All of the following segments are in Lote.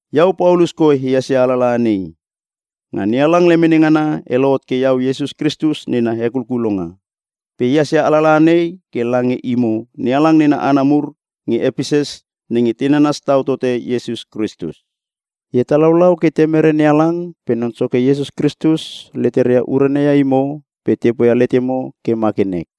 Iau Paulus koi ehas ia alalaha nei. Nga NeHalang lemene ngana e lohot ke iau Iesus Kristus nena hekulkulonga. Pe ehas ia alalaha nei ke lange imo NeHalang nena hana mur nge Epeses nenge te nanas tau tote Iesus Kristus. E hetalaulau ke Temere NeHalang pe Non Soke Iesus Kristus leteria urana ia imo pe te poia letemo ke ma ke nek.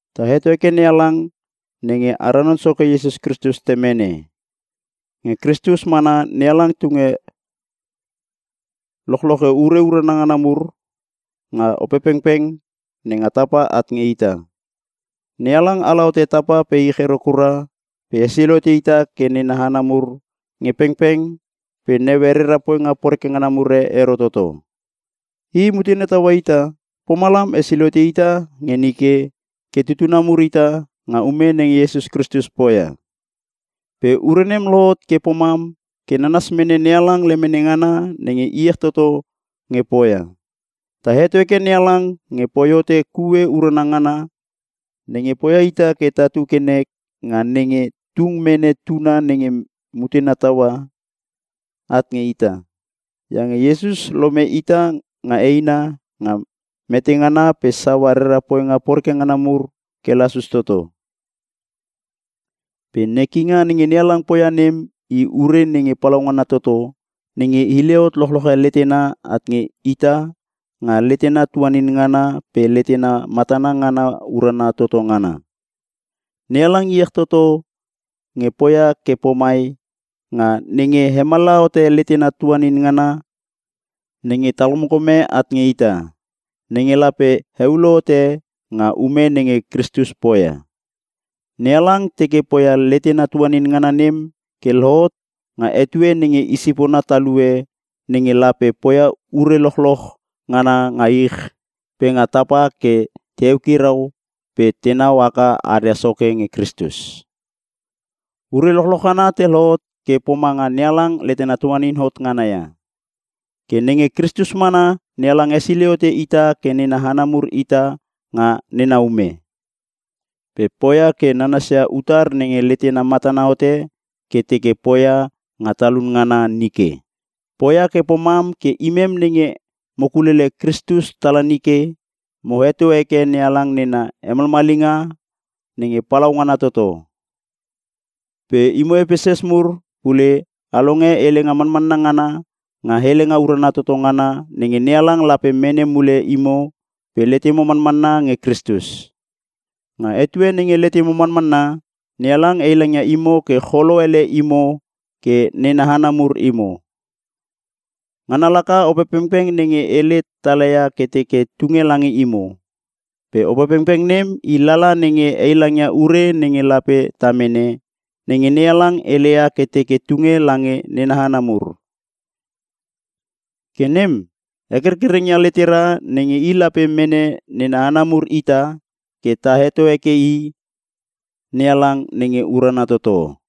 Ta heto heke NeHalang nenge ara Non Soke Iesus Kristus Temene. Nge Kristus mana NeHalang tung lochloche ure urana ngana mur nga Opepengpeng nenga tapa at nge ita. NeHalang ala hote tapa pe ich ero kura pe hesilei hote ita ke nena hana mur nge pengpeng pe naue rera poinga poreke ngana e ero toto. I mutena taua ita pomalam hesilei hote ita nge nike ke tutuna mur ita nga ume nenge Iesus Kristus poia. Pe ure nem lohot ke pomam ke nanas mene NeHalang lemene ngana nenge iech toto nge poia. Ta heto heke NeHalang nge poi hote kue urana ngana nenge poia ita ke tatu ke nek nga nenge tung mene Tuna nenge mutena taua, at nge ita. Iange Kristus lome ita nga eina nga metengana pe saua rera poinga poreke ngana mur ke te lasus toto. Pe nekinga nenge NeHalang poia nem i ure nenge palaungana toto nenge hile hot lochloche letena at nge ita nga letena tuanin ngana pe letena matana ngana urana toto ngana. NeHalang iech toto nge poia ke pomai nga nenge hemallaha hote letena tuanin ngana nenge talkomkome at nge ita, nenge lape heulo hote nga ume nenge Kristus poia. NeHalang teke poia letena tuanin ngana nem ke lohot nga etue nenge i sipona talue nenge lape poia ure lochloch ngana nga ich pe nga tapa ke te eukirau pe tenau haka aria soke nge Kristus. Ure lochloch ngana te lohot ke pomanga NeHalang letena tuanin hot ngana ia. Ke nge Kristus mana NeHalang hesilei hote ita ke nena hana mur ita nga nena ume. Pe poia ke nanasia utar nenge letena matana hote ke teke poia nga talun ngana nike. Poia ke pomam ke imem nenge mo kulelele Kristus tala nike, mo heto heke NeHalang nena hemalmalinga nge palaungana toto. Pe imo Epeses mur pule a longe helenga manmanna ngana nga helenga urana toto ngana nenge NeHalang lape mene mule imo pe letemo manmanna nge Kristus. Nga etue nenge letemo manmanna, NeHalang heilangaia imo ke cholo ele imo ke nena hana mur imo. Ngana laka Opepengpeng nenge hele talaia ke teke tunge lange imo. Pe Opepengpeng nem i lala nenge heilangia ure nenge lape ta mene, nenge NeHalang heleia ke teke tunge lange nena hana mur. Ke nem hekerkereng ia letera nenge i lape mene nena hana mur ita ke ta heto heke i NeHalang nenge urana toto.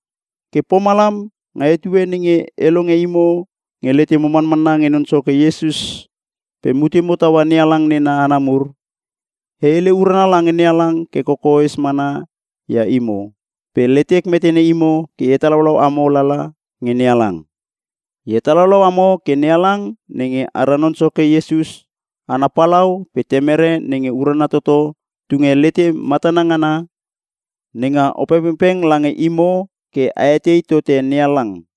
Ke pomalam nga etue nenge e longe imo nge letemo manmanna nge Non Soke Iesus pe mutemo taua NeHalang nena hana mur, e hele urana lange NeHalang ke kokoes mana ia imo, pe letek metene imo ke e hetalaulau amo lala nge NeHalang. E hetalaulau amo ke NeHalang nenge ara Non Soke Iesus ana Palau pe Temere nenge urana toto tunge lete matana ngana nenga Opepengpeng lange imo ke a etei tote NeHalang.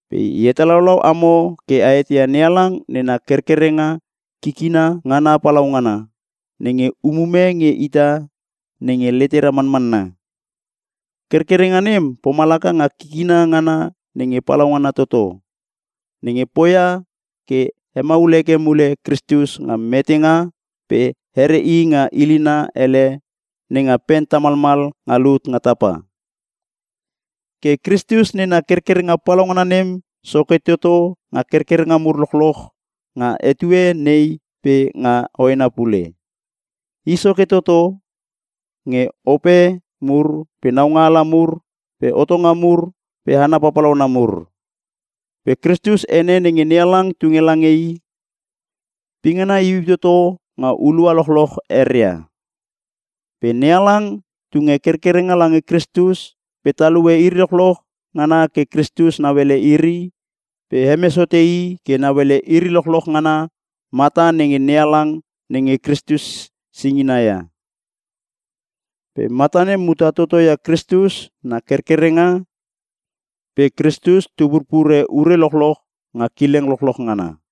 Pe e hetalaulau amo ke a eteia NeHalang nena kerkerenga kikina ngana palaungana, nenge umume nge ita nenge letera manmanna. Kerkerengnga nem pomalaka nga kikina ngana nenge palaungana toto, nenge poia ke hemaul heke mule Kristus nga metenga pe here i nga ilina ele nenga pen tamalmal nga lut nga tapa. Ke Kristus nena kerkerenga palaungana nem soke toto nga kerkerenga mur lochloch nga etue nei pe nga hoena pule. I soke toto nge ope mur pe naungaala mur pe hotonga mur pe hana papalauna mur. Pe Kristus ene nenge NeHalang tunge lange i, pingana iuiu toto nga hulua lochloch eria. Pe NeHalang tunge kerkerenga lange Kristus pe talue iri lochloch ngana ke Kristus nauele iri pe hemes hote i ke nauele iri lochloch nga mata nenge NeHalang nenge Kristus singina ia. Pe mata nem muta toto ia Kristus na kerkerenga pe Kristus tu purpure ure lochloch nga kileng lochloch ngana.